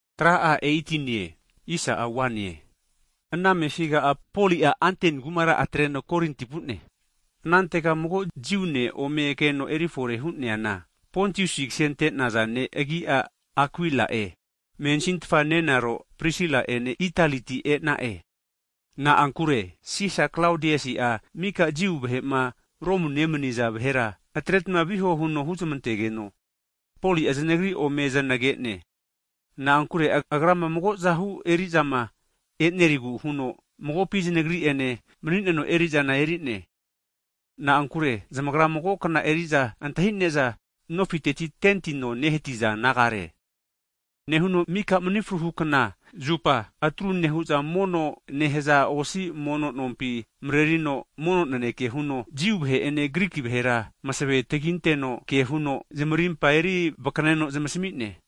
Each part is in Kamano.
Hagi ana amefiga'a, Poli'a Atensi kumara atreno Korinti vu'ne. Anantega mago Jiu ne' ome keno erifore hu'neana, Pontusi kasente'naza ne' agi'a Akuila'e, mensintfa nenaro Prisila ene Italiti e'na'e. Na'ankure Sisa Klaodiasi'a mika Jiu vahe'ma Romu nemani'za vahera atretma viho huno huzmantegeno Poli'a zanagri ome zanage'ne. Na'ankure agrama mago'zahu eri'zama e'nerigu huno magopi zanagri'ene mani'neno eri'zana eri'ne, (na'ankure zamagra mago kna eri'za antahine'za nofiteti seli no nehatiza nagare). Nehuno mika mani fruhu kna (Sabat) zupa atru nehu'za mono nehaza osi mono nompi, marerino mono naneke huno, Jiu vahe'ene Griki vahera masevenke huno zamarimpa eri vakaneno zamasmi'ne.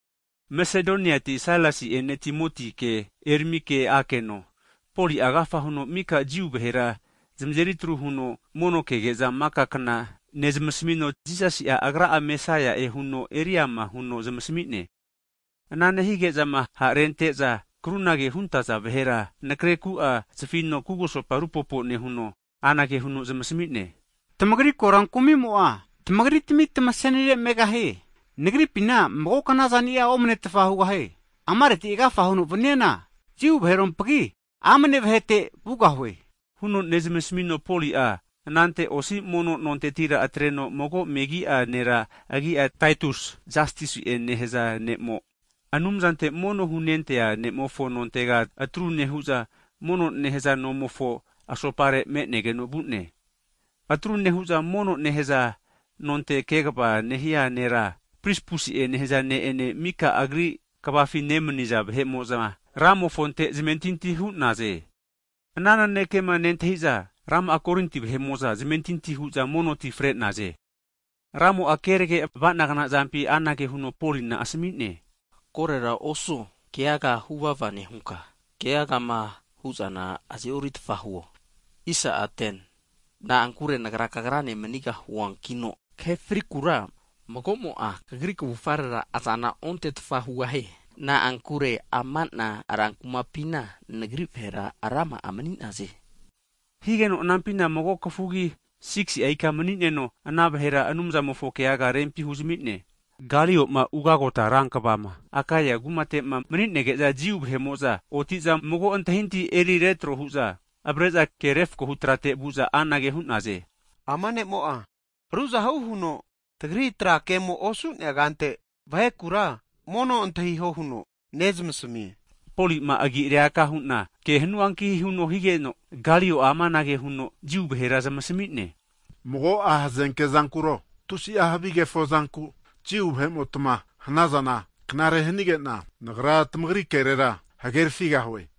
Masedoniati Sailasi'ene Timotike eramike akeno, Poli'a agafa huno mika Jiu vahera zamazeri atru huno mono kege'za maka kna nezamasmino, Jisasi'a, Agra'a tazahuno taguvazi nere huno eriama huno zamasmi'ne. Ana nehige'zama ha'ma rente'za krunagema huntaza vahera anakre ku'a (saket) zafino kugusopa rupopo nehuno anage huno zamasmi'ne, tamagri korankumi'mo'a tamagritami tamasenire megahie! Nagripina mago knazani'a omanetfa hugahie. Amareti agafa huno vaniana, Jiu vaherompage megi'a vahete vugahue. Huno nezamasmino Poli'a anante osi mono nontetira atreno, mago megi'a nera agi'a Taitus Jastusi'e nehaza ne'mo, Anumzante mono hunentea ne'mofo nontega atru nehu'za mono nehaza nomofo asopare me'negeno vu'ne. Atru nehu'za mono nehaza nonte kegava nehia nera (presitent) Krispusi'e nehaza ne'ene, mika agri kvafi nemaniza vahe'mo'za Ramofonte zamentinti hu'naze. Ana nanekema nentahi'za, rama'a Korinti vahe'mo'za zamentinti hu'za mono ti fre'naze. Ramo'a kerage ava'nagna zampi anage huno Polina asami'ne, Korera osuo, keaga huvava nehunka, keagama hu'zana azeoritfa huo. Na'ankure Nagra kagrane manigahuankino, kahe frikura mago'mo'a kagri kavufarera azana ontetfa hugahie. Na'ankure ama'na rankumapina Nagri vahera rama'a mani'naze, nehigeno ke'ne. Higeno anampina mago kafugi sigisi'a ika mani'neno, ana vahera Anumzamofo keaga rempi huzami'ne. Kalio'ma, ugagota rankvama (Gavana) Akaea kumate'ma mani'nege'za, Jiu vahe'mo'za oti'za mago antahintahi eri retro hu'za, avare'za ke refakohu trate (koti nonte) vu'za, anage hu'naze, ama ne'mo'a ruzahu huno tagri tra kemo'a osu'nea kante, vahekura mono antahiho huno nezamasmie nehazageno, Poli'ma agi'reaka hu'na ke hanuanki huno higeno, Kalio'a amanage huno Jiu vahera zamasmi'ne, Mago'a hazenke zankuro, tusi'a havi kefo zanku Jiu vahe'motmama hanazana, knare hanige'na, nagra tamagri kerera hagerfigahue.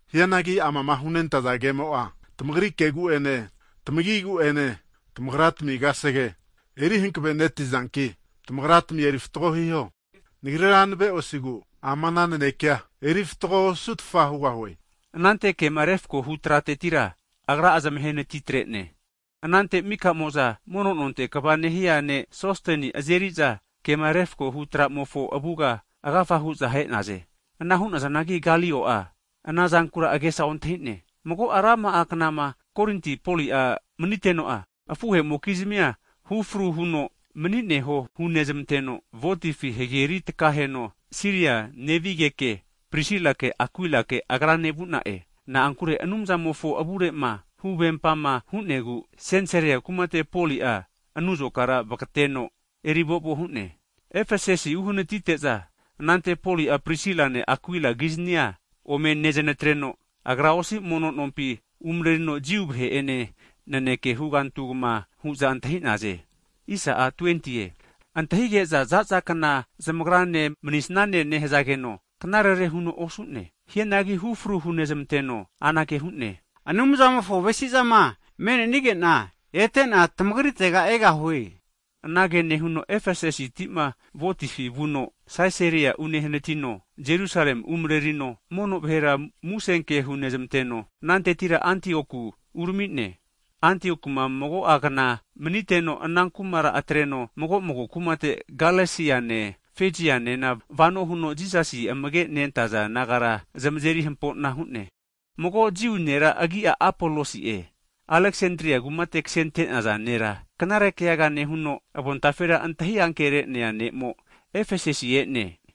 Hianagi amama hunentaza kemo'a tamagra kegu'ene tamagigu'ene, tamagratmi kasege eri hankave netizanki tamagratmi erifatgo hiho. Nagrira nave'osigu ama'na naneke'a erifatgo osugahue. Anante kema refakohu tratetira agra'a zamahe natitre'ne. Anante mika'mo'za mono nonte kva nehia ne' Sosteni azeri'za kema refkohu tramofo avuga agafa hu'za ahe'naze. Ana hu'nazanagi Galio'a ana zankura agesa ontahi'ne. Mago'a rama'a knama Korinti kumate Poli'a maniteno, afuhe'mokizmia hufru huno mani'neho hunezmanteno, ventefi hageri tkaheno Siria nevigeke Prisila'ene Akuilake agrane vu'na'e. Na'ankure Anumzamofo avure'ma huvempama hu'negu, Sensarea kumate Poli'a anuzokara vagateno erivo'vo hu'ne. Efesasi uhanatite'za, anante Poli'a Prisilane, Akuilagiznia ome nezanetreno, agra osi mono nompi umarerino, Jiu vahe'ene naneke hugantugma hu'za antahi'naze. Ana nehu'za antahige'za za'zakna tagrane manisane nehazageno, knarere huno osu'ne. Hianagi hufru hunezmanteno anage hu'ne, Anumzamofo avesi'zama me'nenige'na, ete'na tamagritega egahue. Anage nehuno Efesasiti'ma ventefi, vuno Sisaria unehanatino, Jerusalemi umarerino mono vahera musenke hunezmanteno, anantetira Antioku urami'ne. Antioku'ma mago'a knama maniteno, ana kumara atreno mago'mago kumate Galesiane Fezianena vano huno Jisasi amage nentaza disaipol nagara zamazeri hampo'na hu'ne. Mago Jiu nera, agi'a Apolosi'e, Aleksandria kumate kasente'naza nera, knare keaga nehuno avontafera antahi ankere'nea ne'mo Efesasi e'ne.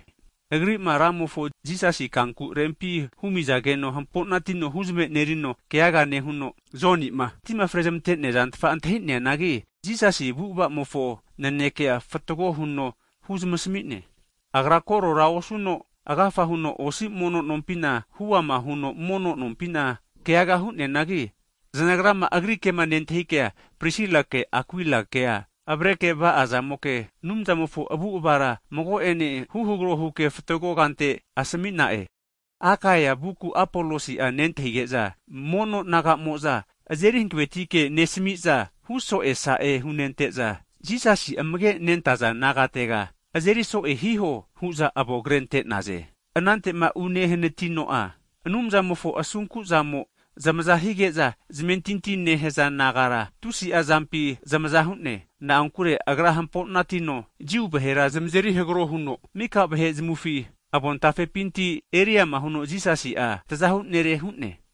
Agri'ma Ramofo Jisasi kanku rempi humi'naza zankura, hamponatino huzmenerino keaga nehuno, Joni'ma tima frezmante'nea zantfa antahi'neanagi, Jisasi avu'ava'mofo nanekea fatgo huno huzamasmi'ne. Agra korora osuno, agafa huno osi mono nompina hu'ama huno mono keaga nehigeke Prisilake, Akuilakea agri kema nentahikea, zanagra avareke va'azamoke Anumzamofo avu'avara mago'ene huhagro huke fatgo kante asami'na'e. Akaea vuku Apolosi'a nentahige'za, mono (kristen) naga'mo'za azeri hanavetike nesamiza huso'e sa'e hunente'za, Jisasi amage nentaza disaipol nagatega azeri so'e hiho hu'za avonkretre'naze. Anante'ma unehanatino'a, Anumzamofo asunku'zamo'a zamaza hige'za zamentinti nehaza nagara tusi'a zampi zamaza hu'ne. Na'ankure agra hampo'natino Jiu vahera zamazeri hagro huno, mika vahe zamufi avontafepinti eriama huno Jisasi'a Tazahu Nere (Kraisi'e) hu'ne.